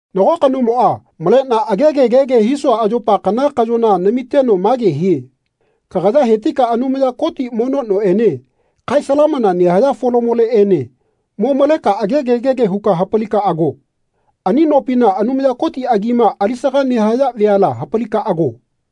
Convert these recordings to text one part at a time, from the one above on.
Nago kanomoꞌa maleꞌna agege gege hisua ayopa kana kaꞌyona namiteno mage hie “Kagaya hetika Anumaya Koti mono noꞌene kae salamana nehaya folamoleꞌene mo maleka agege gege huka hapalika ago. Ani nopina Anumaya Koti agima alisaga nehaya veala hapalika ago.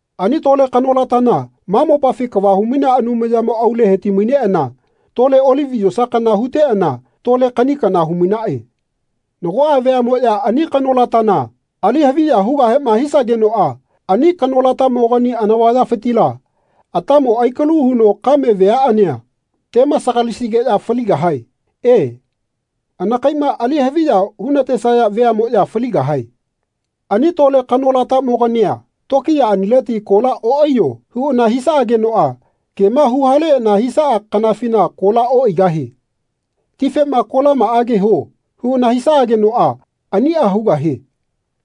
Ani lole kanolatana ma mopafi kava humainea Anumayamo aule heti-mainaꞌana tole olivi yosa kana huteꞌana tole kaꞌni kana humainaꞌe. Nagoꞌa veaꞌmoꞌya ani kanolatana ali haviya hugahema hisagenoꞌa ani kanolatamogani anavayafitila atamo aikalu huno kame veaꞌania temasagalisigeꞌya faligahae. E, anakaiꞌma ali haviya hunatesaya veaꞌmoꞌya faligahae. Ani lole kanolatamo-gania tokiyaꞌanileti “Kola oꞌaiyo.” huꞌana hisaꞌageno kema huhaleꞌana hisaꞌa kanafina kola oꞌaigahie. Tifema “Kolamaꞌage huo.” huꞌana hisaꞌagenoꞌa aniꞌa hugahie.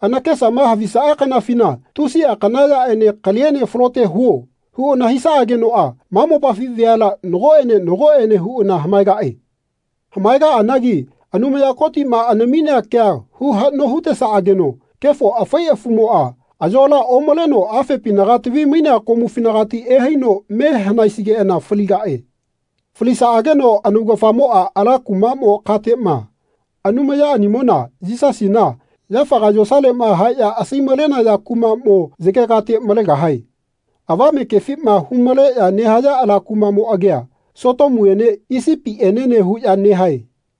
Anakesama havisaꞌa kanafina “Tusiꞌa kana yaꞌene kaliene falote huo.” huꞌana hisaꞌagenoꞌa ma mopafi veala nagoꞌene nagoꞌene huꞌana hamaegaꞌe. Hamaegaꞌanagi Anumaya Kotiꞌma anaminea kea hu haꞌno hutesaꞌageno kefo afai afumoꞌa ayola omaleno afepinaga tavi-mainea komufinagati ehaino me hanaesigeꞌana faligaꞌe. Falisaꞌageno anaugafamoꞌa ala kumaꞌmo kateꞌma, Anumayaꞌanimona Yisasina yafaga yosaleꞌma haeꞌya asai-malenaya kumaꞌmo, yegegate malegahae. Avame kefima hu-maleꞌya nehaya ala kumaꞌmo agia Sotomuene Isipienene huꞌya nehae.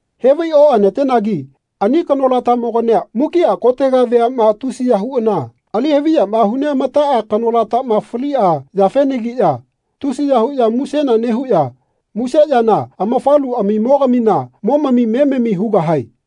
Hevai oꞌanatenagi ani kanolatamogania mukiꞌa kotega veaꞌma tusiya huꞌana ali haviyama hu neꞌamataꞌa kanolatama faliꞌa yafenagiꞌya tusiya huꞌya musena nehuꞌya muse yana amafaluꞌamimo-gamina momami memami hugahae.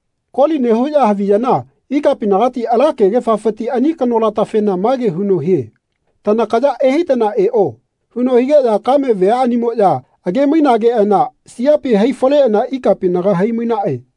Koli nehuꞌya haviyana ikapinagati ala kegefafiti ani kanolatafena mage huno hie “Tanakaya ehaitana eꞌo.” huno higeꞌya kame veaꞌanimoꞌya age-mainageꞌana siapi hai-faleꞌana ikapinaga hai-mainaꞌe.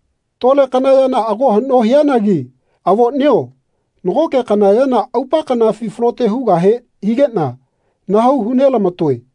Tole kana yana ago haꞌno hianagi avoꞌnio nagoꞌke kana yana aupa kanafi falote hugahe higeꞌna nahau hu nelamatoe.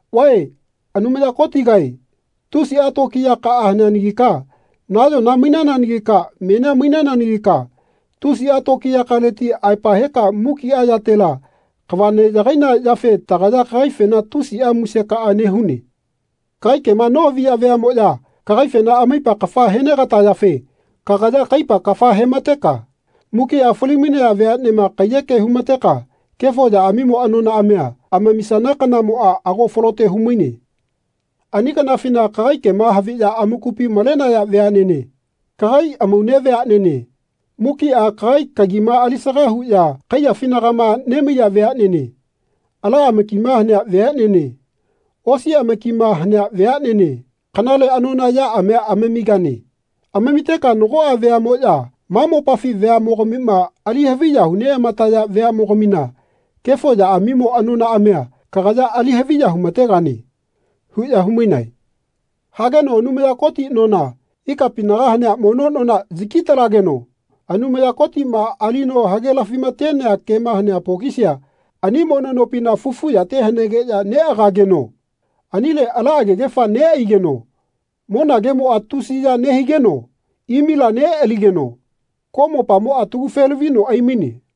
“Vae Anumaya Kotigae tusiꞌa tokiyakaꞌa haneanagika nayona mainananagika menia mainananagika tusiꞌa tokiyakaleti aepa heka mukiꞌa yatela kava neꞌyagaina yafe tagaya kagaifena tusiꞌa musekaꞌa nehune. Kagai kema nohavia veaꞌmoꞌya kagaifena amaipa kafa henegatayafe kagaya kaipa kafa hemateka mukiꞌa fali-mainaya veaꞌnema kaiyeke humateka kefo yaꞌamimo anonaꞌamia amamisana kanamoꞌa ago falote humaine. Ani kanafina kagai kema haviꞌya amakupi malenaya veaꞌnene kagai amaune veaꞌnene mukiꞌa kagai kagima alisaga huꞌya kaiyafinagama nemaiya veaꞌnene ala amakima hanea veaꞌnene osi amakima hanea veaꞌnene kanale anona yaꞌamia amamigane. Amamiteka nagoꞌa veaꞌmoꞌya ma mopafi veaꞌmogamima ali haviya huneꞌamataya veaꞌmogamina kefo yaꞌamimo anonaꞌamia kagaya ali haviya humategane.” huꞌya humainae. Hageno Anumaya Koti nona ikapinaga hanea mono nona yaki-talageno Anumaya Kotiꞌma alino hagelafimatenea kema hanea pokisia ani mono nopina fufu yate hanegeꞌya neꞌagageno anile ala agegefa neꞌaigeno monagemoꞌa tusiya nehigeno imila neꞌaligeno koꞌmopamoꞌa talagufe-lavino aimaine.